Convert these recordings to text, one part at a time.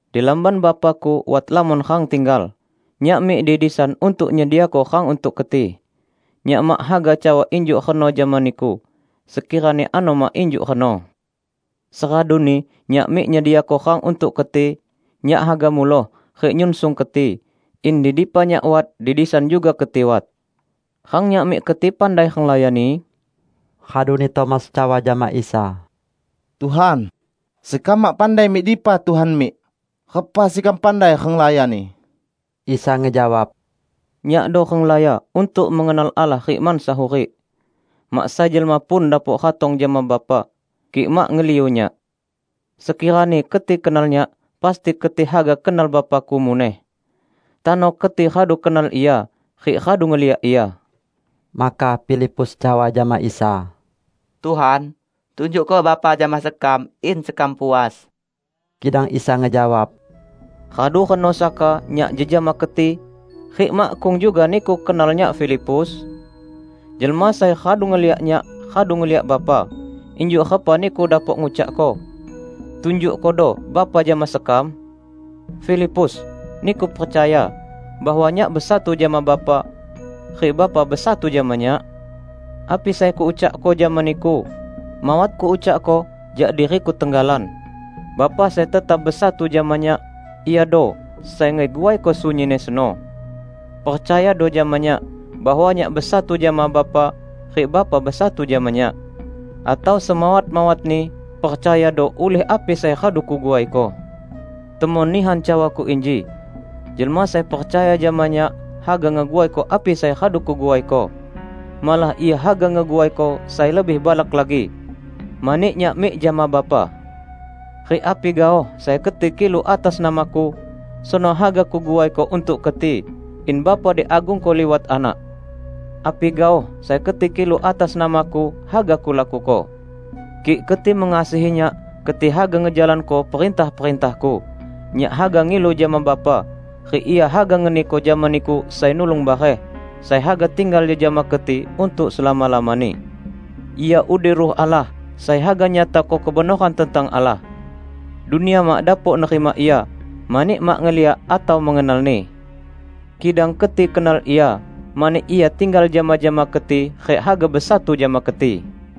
Di lamban Bapa-Ku wat lamon rang tinggal. Nyak mik di disan untuk nyediako rang untuk keti. Nyak mak haga cawa injuk reno jama niku, sekirani ano mak injuk reno. Seraduni Nyak mik nyediako rang untuk keti, Nyak haga muloh rik nyunsung keti, in di dipa Nyak wat, di disan juga keti wat. Rang Nyak mik keti pandai renglayani?" Raduni Tomas cawa jama Isa, "Tuhan, sekam mak pandai mik dipa Tuhan mik, repa sekam pandai renglayani?" Isa ngejawab, "Nyakdo renglaya untuk mengenal Allah rik mansa hurik. Mak sai jelma pun dapok ratong jama Bapa, kik mak ngeliu Nyak. Sekirani keti kenal Nyak, pasti keti haga kenal Bapa-Ku muneh. Tano keti radu kenal Ia, rik radu ngeliak Ia." Maka Filipus cawa jama Isa, "Tuhan, tunjukko Bapa jama sekam, in sekam puas." Kidang Isa ngejawab, "Radu reno saka Nyak jejama keti, rik makkung juga niku kenal Nyak, Filipus? Jelma sai radu ngeliak Nyak, radu ngeliak Bapa. Injuk repa niku dapok ngucakko, 'Tunjukkodo Bapa jama sekam'? Filipus! Niku percaya, bahwa Nyak besatu jama Bapa, rik Bapa besatu jama Nyak? Api sai Kuucakko jama niku, mawat Kuucakko jak diri-Ku tenggalan. Bapa sai tetap besatu jama Nyak, Iado sai ngeguaiko sunyinni seno. Percayado jama Nyak, bahwa Nyak besatu jama Bapa rik Bapa besatu jama Nyak. Atau semawat-mawatni, percayado ulih api sai radu Kuguaiko. Temon nihan cawa-Ku inji: Jelma sai percaya jama Nyak, haga ngeguaiko api sai radu Kuguaiko, -- malah ia haga ngeguaiko sai lebih balak lagi -- mani Nyak mik jama Bapa. Rik api gaoh sai keti kilu atas nama-Ku, seno haga Kuguaiko untuk keti, in Bapa diagungko liwat Anak. Api gaoh sai keti kilu atas nama-Ku, haga Kulakuko." "Kik keti mengasihi Nyak, keti haga ngejalanko perintah-perintah-Ku. Nyak haga ngilu jama Bapa, rik Ia haga ngeniko jama niku Sai Nulung bareh, sai haga tinggal jejama keti untuk selama-lamani. Ia udi Ruh Allah sai haga nyatako kebenoran tentang Allah. Dunia mak dapok nerima Ia, mani mak ngeliak atau mengenal-Ni. Kidang keti kenal Ia, mani Ia tinggal jama-jama keti rik haga besatu jama keti.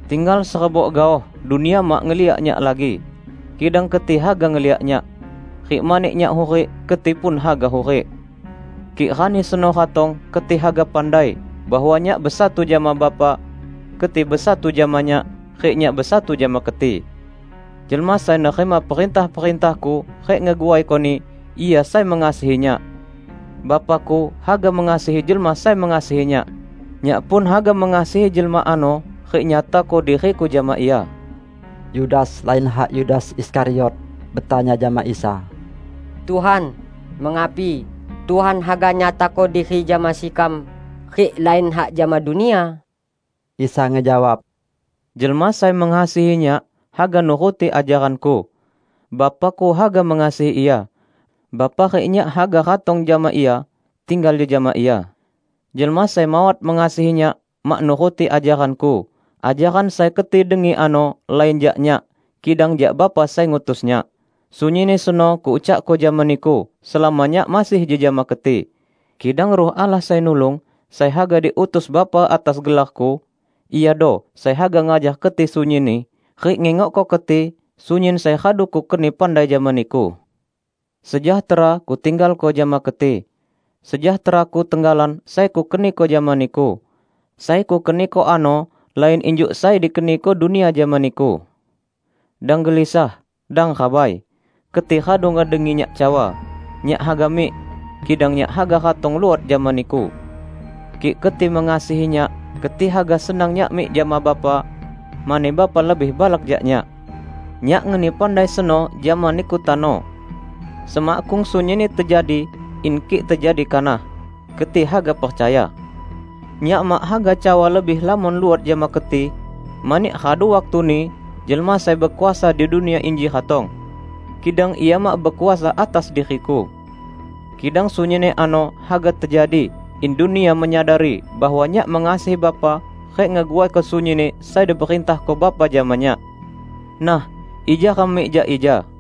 Tinggal serebok gaoh dunia mak ngeliak Nyak lagi. Kidang keti haga ngeliak Nyak. Rik mani Nyak hurik, keti pun haga hurik. Kik rani seno ratong, keti haga pandai bahwa Nyak besatu jama Bapa, keti besatu jama Nyak, rik Nyak besatu jama keti. Jelma sai nerima perintah-perintah-Ku rik ngeguaikoni, ia sai mengasihi Nyak. Bapa-Ku haga mengasihi jelma sai mengasihi Nyak. Nyak pun haga mengasihi jelma ano rik nyatako diri-Ku jama ia." Yudas (lain hak Yudas Iskariot) betanya jama Isa, "Tuhan, mengapi, Tuhan haga nyatako diri jama sekam rik lain hak jama dunia?" Isa ngejawab, "Jelma sai mengasihi Nyak, haga nuruti ajaran-Ku. Bapa-Ku haga mengasihi ia. Bapa rik Nyak haga ratong jama ia rik tinggal jejama ia. Jelma sai mawat mengasihi Nyak, mak nuruti ajaran-Ku. Ajaran sai keti dengi ano, lain jak Nyak, kidang jak Bapa sai ngutus Nyak. Sunyinni seno Kuucakko jama niku selama Nyak masih jejama keti. Kidang Ruh Allah, Sai Nulung sai haga diutus Bapa atas gelar-Ku, Iado sai haga ngajar keti sunyinni rik ngingokko keti sunyin sai radu Kukeni pandai jama niku. Sejahtera Kutinggalko jama keti. Sejahtera-Ku tenggalan sai Kukeniko jama niku. Sai Kukeniko ano lain injuk sai dikeniko dunia jama niku. Dang gelisah, dang rabai. Keti radu ngedengi Nyak cawa, 'Nyak haga mik, kidang Nyak haga ratong luot jama niku'! Kik keti mengasihi Nyak, keti haga senang Nyak mik jama Bapa, mani Bapa lebih balak jak Nyak. Nyak ngeni pandai seno jama niku tano, semakkung sunyinni tejadi, in kik tejadi kanah, keti haga percaya. Nyak mak haga cawa lebih lamon luot jama keti, mani radu waktuni jelma sai bekuasa di dunia inji ratong. Kidang ia mak bekuasa atas diri-Ku. Kidang sunyinni ano haga tejadi in dunia menyadari bahwa Nyak mengasihi Bapa rik ngeguaiko sunyinni sai diperintahko Bapa jama Nyak. Nah, ija ram mik jak ija."